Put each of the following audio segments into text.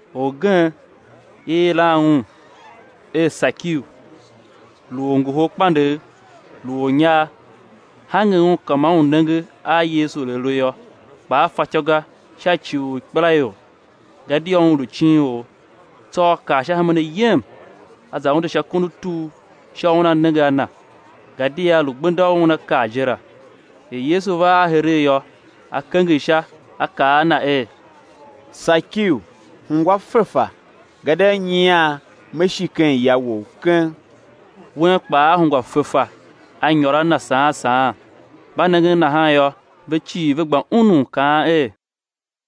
Orgen, i yilan un er Sakiu, lu orngoholkpandegh, lu ornyar; hange un ka ma un nenge a Yesu er A lu yô, kpa a fatyô ga sha ci u ikpelaior, gadia un lu icinor. Tsô a kar sha hemen ayem, a za unde sha kon u tur sha u una nenge a na, gadia lu gbenda u Una kar je la. Er Yesu va ar heregh yô, A kenger sha, A kaa a na er: Sakiu, hungwa fefa, gadia nyian Me shi ken ya wou keng. Wen kpaa a hungwa fefa a nyôr a Na saan saan. Mba nengen nahan yô, ve cii ve gba unun kaan er: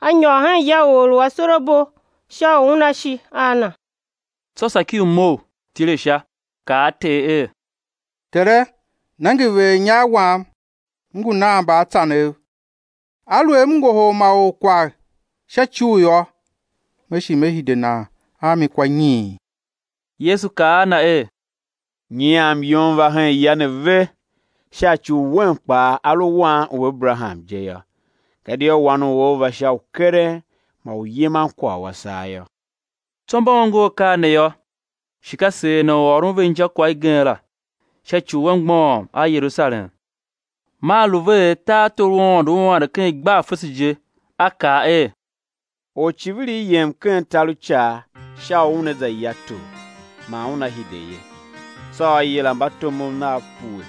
A nyôr hen ya u or u asorabo sha u Una shi a na. Tsô Sakiu mough, tile sha, kaa a Ter er: Tere, nenge, veghernyar wam m ngu nan mbaatsanev; aluer m ngohol ma or kwagh sha icugh yô, me shi me hide nan a mi kwa nyiin. Yesu kaa a na er: Nyian myom va hen ya ne ve, sha ci u wen kpaa a lu wan u Aberaham je yô. Gadia Wan u or va sha u keren man u yiman kwagh u a saa yô. Tsô mba ongo akaa ne yô, shi ka seer Na u ôron ve injakwagh igen la, sha ci u A mgbôghom a Yerusalem, man lu ve er tartor u Aôndo ua ande ken igbar fese je. A kaa er: Oricivirigh yem ken tar u icaa sha u una za ya tor, man una hide ye. Tsô a yila mbatomov nav pue,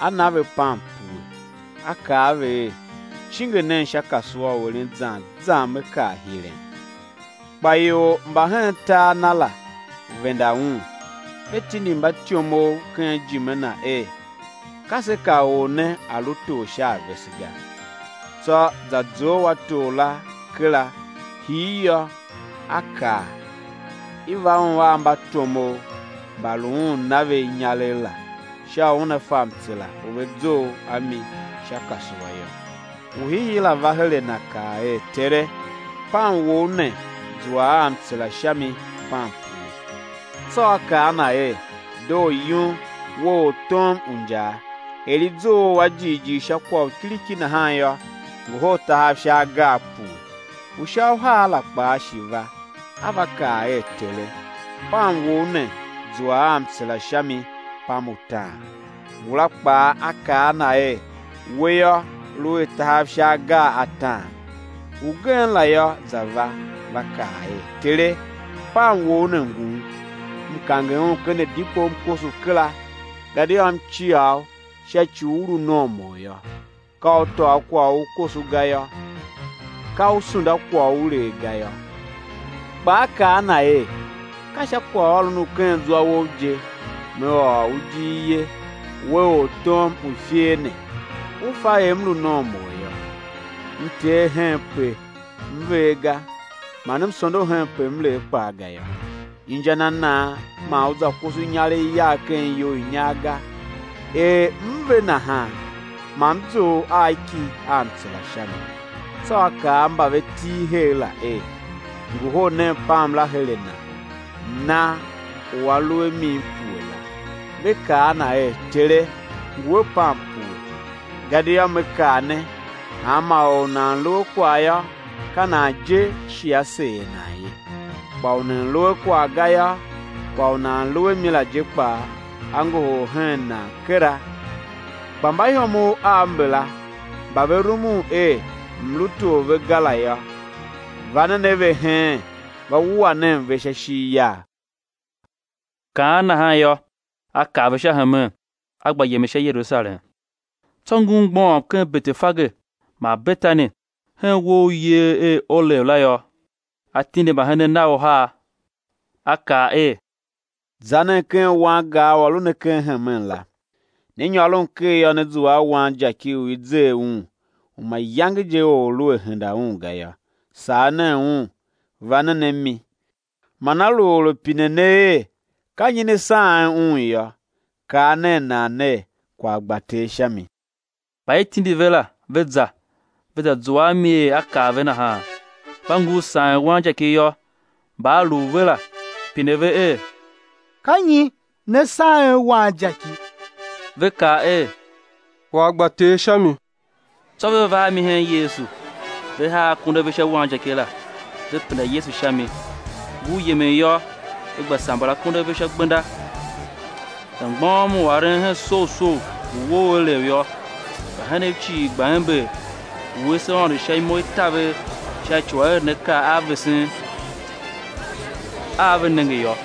a na ve pam pue, a kaa a ve er: Cinge nen sha kasua u eren zan zan me kar hiren. Kpa ior mba hen tar na la venda un, ve tindi mbatyomov ken ijime na er: Ka se ka or ne a̱ lu tor sha a vese ga. Tsô za zough a tor la kera, hir yô, a kaa, i̱ va un a mbatomov mba lu un na ve inyaregh la, sha u una fa mtsera u ve zough a mi sha kasua yô. U hiihii la va her a na kaa er: Tere, pam wou ne zua a mtsera sha mi pam pue. Tsô a kaa a na er: Doo yum, we ortom u injaa! Er i zough u a jighjigh sha kwagh u kiriki nahan yô, ngohol tahav sha agar pue. U sha uhar la kpaa shi va, a va kaa er: Tere, pam wou ne zua a mtsera sha mi pam utaan. Ngula kpaa a kaa a na er: We yô, lu a tahav sha agar ataan. Ugen la yô, za va, va kaa er: Tere, pam wou ne ngun, m kange un ken adikpo m koso kera; gadia m cia u sha ci u u lu nomor yô; ka u tôô kwagh u u koso ga yô; ka u sunda kwagh u u lee ga yô. Kpa a kaa a na er: Ka sha kwagh ôron u ken zwa wou je man me ôr u ijir ye, we ortom u ifer ne! U fa er m lu nomor yô, m tee henpe m ver ga, man m sondo henpe m lee kpaa ga yô. Inja na nan man u za koso inyaregh yagh ken iyou i inyar ga, er m ve nahan, ma m zough a ki a mtsera sha mi. Tsô A kaa a mba ve til her la er: Ngohol nen pam la her a na, na u a lu a mi pue la. Ve kaa a na er: Tere, ngu a pam pue. Gadia Me kaa ne, hanma or u nan lu a kwagh yô, ka nan je shi á seer nan ye; kpa u nan lu a kwagh ga yô, kwagh u nan lu a mi la je kpaa á ngohol hen nan kera. Kpa mbaihomov av mbala mba ve rumun er m̱ lu tor ve ga la yô, va nen a ve heen, va wua nen ve sha ishigh yagh. Kaan nahan yô, A kar ve sha hemen, A gba yemen sha Yerusalem. Tsô ngur mgbôghom ken Betefage man Betani, hen uwo u i yer er Olev la yô, A tindi mbahenen Nav uhar, A kaa er: Za nen ken wangar u a lu ne ken hemen la; né nyôron ker yô, né zua a wanjaki u i zer un, u mayange je or lu a henda un ga yô; sagh nen un, va nen a mi. Man á lu or a pine ne er: Ka nyi ne saghen un yô, kaa nen nan ner: Kwagh gba Ter sha mi. Mba i tindi ve la, ve za, ve za zua a mi er A kaa ve nahan. Mba ngur saghen wanjaki yô, mba a lu u ve la, pine ve er: Ka nyi ne saghen wanjaki? Ve kaa er: Kwagh gba Ter sha mi. Tsô ve va a mi hen Yesu, ve haa akondo a ve sha wanjaki la, ve penda Yesu sha mi. Ngur yemen yô, ve gba samber akondo a ve sha gbenda. Za mgbôghom u aren hen soughsough u uwo u Olev yô, mbahenen cii gba ember, wuese Aôndo sha imo i taver sha ci u aerenakaa a vesen a ve nenge yô,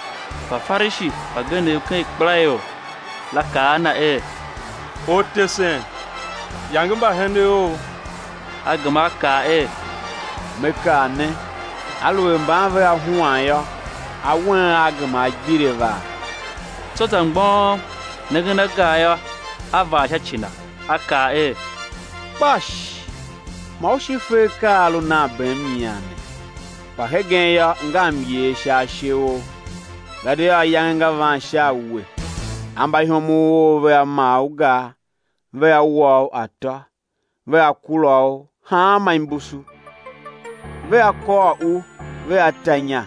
Mbafarishi mbagenev ken ikpelaior la kaa a Na er: Ortesen, yange mbahenen Ou! A gema A kaa er: Me kaa ne, aluer mban vea huan yô, awen aa gema á gbire vaa. Tsô za mgbôghom, nengen a gar yô, A vaa sha ci na. A kaa er: Kpash, ma u shi fe akaa a a lu nan bem nyian ne; kpa hegen yô, nga myer sha ashe ou. Gadia ayange nga van sha a we, a mbaihomov ou vea maa u gar, vea wa u atô, vea kura u hanma imbusu. Vea kôr u vea ta inya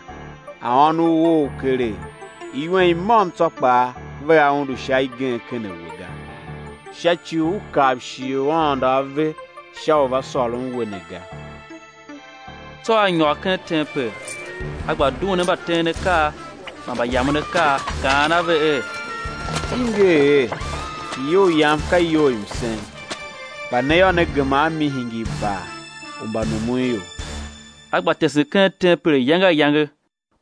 a ônov ou keregh; iwen i môm tsô kpaa vea undu sha igen ken a we ga; sha ci u u kav shighe u Aôndo A ve sha u va sôron we ne ga. Tsô A nyôr ken tempel, A gba duen a mbateenakaa man mbayamenakaa, kaan a ve er: I nger er: Iyou Yam ka iyou i msen, kpa ne yô, ne gema a mi hingir bar u mbanumunior. A gba tesen ken tempel ayange ayange;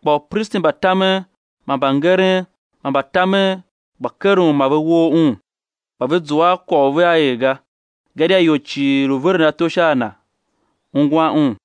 kpa upristi mba tamen man mbangeren man mbatamen gba keren u ma ve woo Un. Kpa ve zua a kwagh u vea er ga; gadia ior cii lu veren ato sha a Na, ungwan Un.